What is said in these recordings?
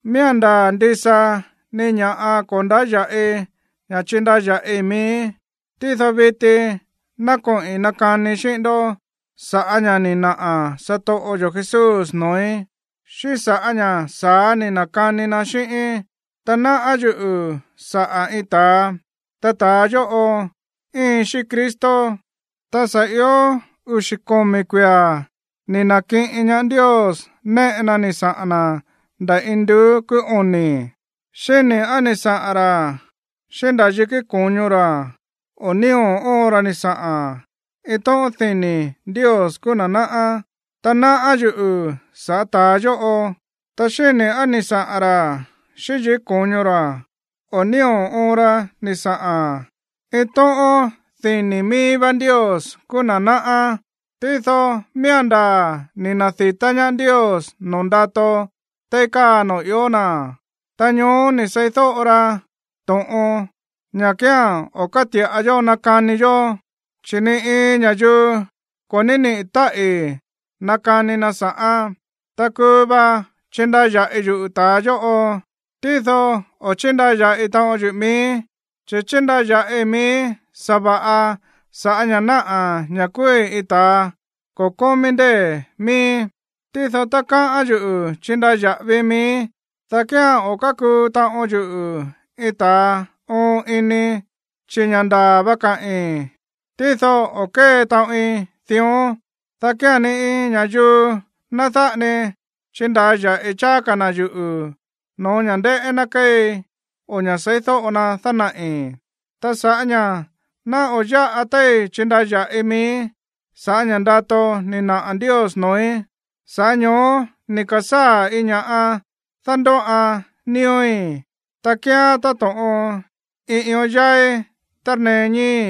Miía̱n ndaa̱ ndisa ni ña̱ꞌa ko̱ ndáya̱ꞌi ña̱ chindaya̱ꞌii miíí, tído viti ná koꞌi̱n nakanii xíꞌín ndó sa̱ꞌá ña̱ ni̱ naꞌa̱ satoꞌo yo̱ Jesús noo̱í, xíꞌín sa̱ꞌá ña̱ sa̱á ni̱ na̱kani na xíꞌíín. Ta náꞌá yuꞌu̱ saꞌa̱ iin ta̱a, ta ta̱a yóꞌo íin xíꞌín Cristo, ta sa̱ io uxi̱ komi̱ kuia̱ ni̱ na̱kiꞌin ñaá Ndios néꞌe na ni̱ saꞌa̱n na̱ nda̱ induú kúú oni̱. Xíni̱ á ni̱ saꞌa̱n ra̱ xíꞌín nda̱ yikí ko̱ño ra̱, o nío̱ óon ra ni̱ saꞌa̱n. Iin tóꞌón dini̱ Ndios kúú na̱ náꞌá. Ta náꞌá yuꞌu̱ sa̱ꞌá ta̱a yóꞌo, ta xíni̱ á ni̱ saꞌa̱n ra̱ xíꞌín yikí ko̱ño ra̱, o nío̱ óon ra ni̱ saꞌa̱n. Iin tóꞌón dini̱ mií vá Ndios kúú na̱ náꞌá. Tído miía̱n ndaa̱ ni̱ na̱di̱tá ñaá Ndios noo̱ ndato téí káa noo̱ ió na̱. Ta ñoó ni̱ seídóꞌo ra to̱ꞌon, ña̱ kía̱n o̱ káti̱ꞌa yó nakani yó, chi̱ ni iin ña̱yuu ko̱ ní niꞌi̱ táꞌi̱ nakani na sa̱ꞌán. Ta kuu va chindaya̱ꞌi yuꞌu̱ ta̱a yóꞌo, tído o̱ chíndaya̱ꞌi taꞌon yuꞌu̱ miíí, chi̱ chindaya̱ꞌii miíí sa̱va̱ꞌa sa̱ꞌá ña̱ náꞌa̱ ña̱ kúúí iin ta̱ ko̱ kómí ndée̱ mííí. Tído tá káꞌán yuꞌu̱ chindaya̱ꞌavii miíí, dá kía̱n o̱ kákuu taꞌon yuꞌu̱ iin ta̱a oon ini, chi̱ ña̱ ndaa̱ va kaꞌi̱n. Tído o̱ kée taꞌoin dión, dá kía̱n ni iin ña̱yuu ná dáꞌa ni chindaya̱ꞌi cháá ka̱ na̱ yuꞌu̱ no̱ó ña̱ ndéꞌé ná kéei o ña̱ seídóꞌo na dánaꞌi̱. Ta sa̱ꞌá ña̱ ná o̱ yáꞌa téí chindaya̱ꞌii miíí sa̱ꞌá ña̱ ndato ni̱ naꞌa̱ Ndios noo̱í, sa̱ꞌá ño̱ó ni̱ ka̱sáa̱ iin ña̱ꞌa dándóꞌan nío̱í, ta kíán táto̱ꞌon iin ión yáí tárnee ñíi̱í,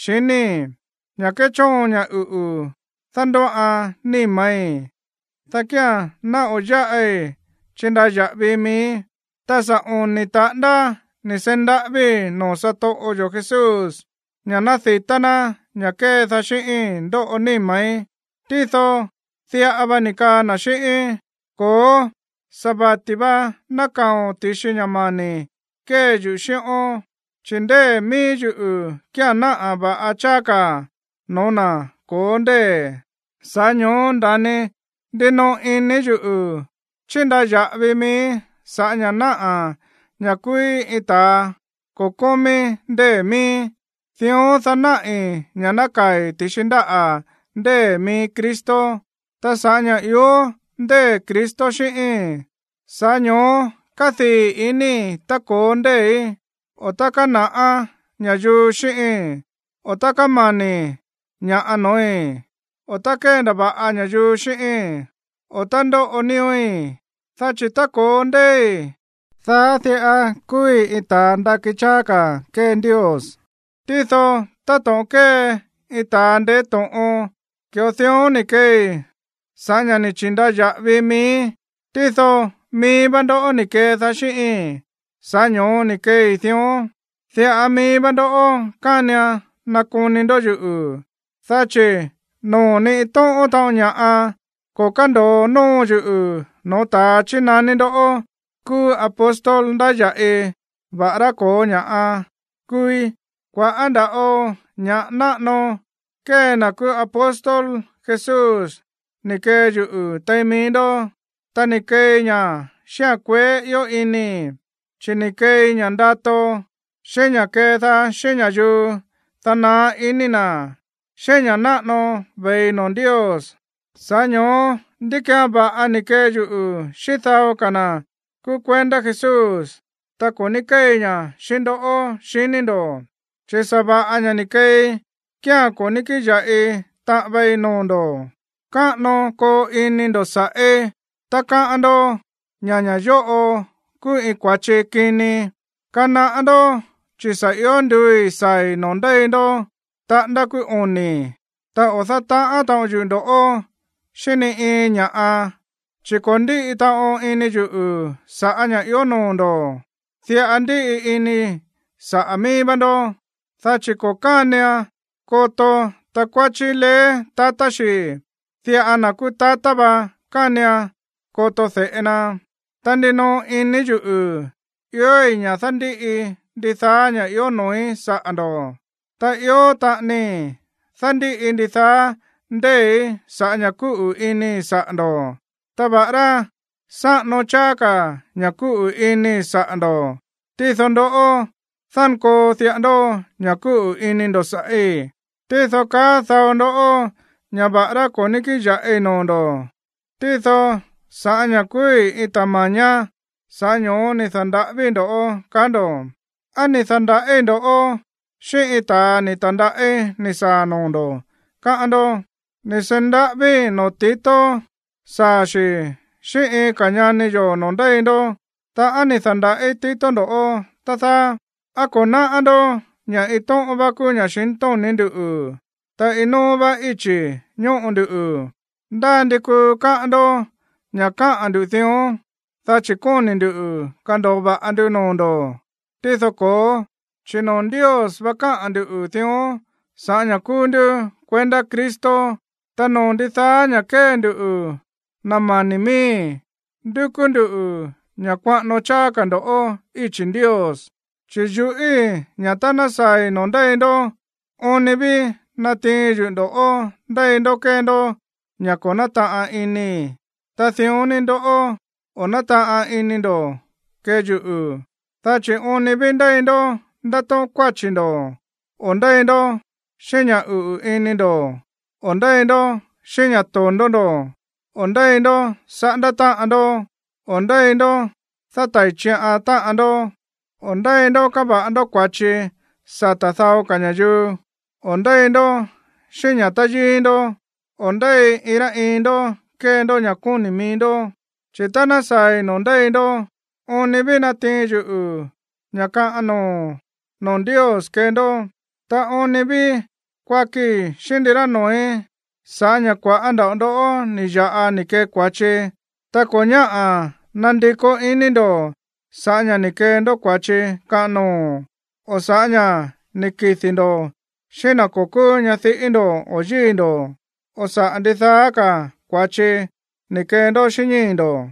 xiníi̱, ña̱ kéchóon ña̱ uꞌu̱ dándóꞌan níma̱í, dá kía̱n ná o̱ yáꞌi chindaya̱ꞌavi miíí. Ta sa̱ oni̱ taꞌándá ni̱ seí ndaꞌávíi̱ noo̱ satoꞌo yo̱ Jesús ña̱ ná di̱tá ná ña̱ kédaá xíꞌíi̱n ndóꞌo níma̱í. Tído diꞌa va ni̱ kaa na̱ xíꞌíín: “Ko̱ó, sa̱ vati̱ va nákaa̱o̱n ti̱xi ña̱ mani̱ kée yuꞌu̱ xíꞌón, chi̱ ndée̱ mií yuꞌu̱ kía̱n náꞌa̱ va̱ꞌa cháá ka̱ no̱ó na̱ ko̱ó ndée̱.” Sa̱ꞌá ño̱ó nda̱ni ndinoꞌo ini yuꞌu̱ chindaya̱ꞌavii miíí sa̱ꞌá ña̱ náꞌa̱ ña̱ kúúí iin ta̱a ko̱ kómí ndée̱ mííí, dión, dá náꞌi̱ ña̱ nákaa̱i̱ ti̱xi ndáꞌa̱ ndée̱ mií Cristo. Ta sa̱ꞌá ña̱ ió ndée̱ Cristo xíꞌíi̱n, sa̱ꞌá ño̱ó kádii̱ inii̱ tá ko̱ó ndée̱í, o tá kána̱ꞌá ña̱yuu xíꞌíi̱n, o tá kámani̱ ña̱ꞌa no̱ói̱, o tá kéndava̱ꞌa ña̱yuu xíꞌíi̱n, o tá ndóꞌo nío̱í. Dá chi̱ tá ko̱ó ndée̱í, dá diꞌa kúúí iin ta̱a ndakí cháá ka̱ kée Ndios. Tído, táto̱ꞌon kée iin ta̱ ndeé to̱ꞌon, ki̱ꞌo dión ni̱ keei sa̱ꞌá ña̱ ni̱ chi̱ndaya̱ꞌavi miíí, tído mií vá ndó ni̱ kedaá xíꞌíi̱n, sa̱ꞌá ño̱ó ni̱ keei dión. Diꞌa mií vá ndó kánian nakoni ndo̱ yuꞌu̱, dá chi̱ noo̱ ni iin tóꞌón taꞌon ña̱ꞌa ko̱ kándo̱o nóo yuꞌu̱ no̱ó ta̱a chínaní ndó kúú apóstol ndáya̱ꞌi, va̱ꞌará ko̱ó ña̱ꞌa kúúí. Kua̱ꞌá nda̱ꞌo ña̱ꞌa náꞌano kée na̱ kúú apóstol Jesús ni̱ kee yuꞌu̱ tein mií ndó, ta ni̱ keei ña̱ xíꞌa̱n kueé ió inii̱, chi̱ ni̱ keei ña̱ ndato, xíꞌín ña̱ kédaá xíꞌín ña̱yuu, dá naá iní na̱, xíꞌín ña̱ náꞌano ve̱i noo̱ Ndios. Sa̱ꞌá ño̱ó, ¿ndí ki̱án va̱ꞌa ni̱ kee yuꞌu̱ xíꞌín dao ka̱ na̱ kúú kuendá Jesús, ta ko̱ ní kéei ña̱ xíꞌín ndoꞌó, xiní ndo̱? Chi̱ sa̱va̱ꞌa ña̱ ni̱ kee kía̱n ko̱ ní kíꞌin ya̱ꞌi taꞌan vei noo̱ ndo̱. ¡Káꞌano koo ini ndo̱ sa̱ꞌí tá káꞌán ndó ña̱ ña̱ yóꞌo kúú iin kua̱chi kini! Kanaꞌá ndó, chi̱ sa̱ ió nduui̱ saa̱i̱ noo̱ ndéi ndó taꞌándá kúú oni̱. Ta o̱ dátaꞌán taꞌon yuꞌu̱ ndo̱ꞌó xíꞌín ni iin ña̱ꞌa, chi̱ ko̱ ndíꞌi taꞌon ini yuꞌu̱ sa̱ꞌá ña̱ ió noo̱ ndo̱, diꞌa ndíꞌi inii̱ saꞌa̱ míí vá ndó. Dá chi̱ ko̱ kánian koto takuáchí leé tatá xi̱, diꞌa na̱ kúú tatá va kánian koto de̱ꞌe na. Ta ndinoꞌo ini yuꞌu̱ iói̱ ña̱ dándíꞌi ndidaá ña̱ ió noo̱í saꞌa̱ ndo̱, ta ió taꞌanii dándíꞌi ndidaá ndée̱í sa̱ꞌá ña̱ kúꞌu̱ inii̱ saꞌa̱ ndo̱. Ta va̱ꞌará sáꞌano cháá ka̱ ña̱ kúꞌu̱ inii̱ saꞌa̱ ndo̱, tído ndoꞌó, dánkoo diꞌa ndó ña̱ kúꞌu̱ ini ndo̱ sa̱ꞌí. Tído kaá dao ndó ña̱ va̱ꞌará ko̱ ní kíꞌin ya̱ꞌi noo̱ ndo̱, tído sa̱ꞌá ña̱ kúúí iin ta̱ ma̱ñá, sa̱ꞌá ño̱ó ni̱ da̱nda̱ꞌávíi̱ ndo̱ꞌó, kaá ndo̱. ¿Á ni̱ da̱nda̱ꞌíi̱ ndo̱ꞌó xíꞌín iin ta̱a ni̱ ta̱ndaꞌí ni̱ saa̱ noo̱ ndo̱, káꞌán ndó? Ni̱ seí ndaꞌávíi̱ noo̱ Tito saa̱ xi̱ xíꞌín iin ka̱ ñani yo̱ noo̱ ndéi ndó. Ta, ¿á ni̱ da̱nda̱ꞌí Tito ndo̱ꞌó, tá dáá? ¿Á ko̱ náꞌá ndó ña̱ iin tóꞌón vá kúú ña̱xintóni̱ ndú, ta iin nóó vá íchi̱ ñóꞌo nduꞌu̱? Ndá ndi kuu káꞌán ndó ña̱ káꞌa̱n ndu̱ dión, dá chi̱ kóni̱ ndu̱ kando̱o va̱ꞌa ndu noo̱ ndo̱. Tído ko̱ó, chi̱ noo̱ Ndios vá káꞌa̱n ndu̱ dión sa̱ꞌá ña̱ kúú ndú kuendá Cristo. Ta noo̱ ndidaá ña̱ kée ndu, na̱ mani̱ miíi̱, ndúkú nduꞌu̱ ña̱ kuaꞌano cháá ka̱ ndo̱ íchi̱ Ndios. Chi̱ yuꞌíi̱ ña̱ tá ná saa̱i̱ noo̱ ndéi ndó, oon ni ví natiin yuꞌu̱ ndo̱ꞌó ndéi ndó kée ndó ña̱ ko̱ nátaꞌan inii̱, ta dión ni ndoꞌó, o̱ nátaꞌan ini ndo̱ kee yuꞌu̱. Dá chi̱ oon ni ví ndéi ndó ndátóꞌón kuáchi̱ ndo̱, o ndéi ndó xíꞌín ña̱ uꞌu̱ ini ndo̱, o ndéi ndó xíꞌín ña̱ to̱ndó ndo̱, o ndéi ndó saꞌándá táꞌan ndó, o ndéi ndó dátai̱ chiꞌan táꞌan ndó, o ndéi ndó káva̱ꞌa ndó kua̱chi sata̱ dao ka̱ ña̱yuu, o ndéi ndó xíꞌín ña̱ táyíí ndó, o ndéi iin rá iin ndó kée ndó ña̱ kóni̱ mií ndó. Chi̱ tá ná saa̱i̱ noo̱ ndéi ndó, oon ni ví natiin yuꞌu̱ ña̱ kaꞌan noo̱ noo̱ Ndios kee ndó. Ta oon ni ví kuakii xíꞌín ndirá noo̱í sa̱ꞌá ña̱ kua̱ꞌá nda̱ꞌo ndó ni̱ ya̱ꞌa ni̱ kee kua̱chi, ta ko̱ ñáꞌa̱ nandikó iní ndo̱ sa̱ꞌá ña̱ ni̱ kee ndó kua̱chi kaꞌan noo̱, o sa̱ꞌá ña̱ ni̱ kidi̱ ndo̱ xíꞌín na̱ ko̱ kúú ñadiꞌí ndo̱ o yíi̱ ndo̱, o sa̱ꞌá ndidaá ka̱ kua̱chi ni̱ kee ndó xíꞌín ñíi̱ ndo̱.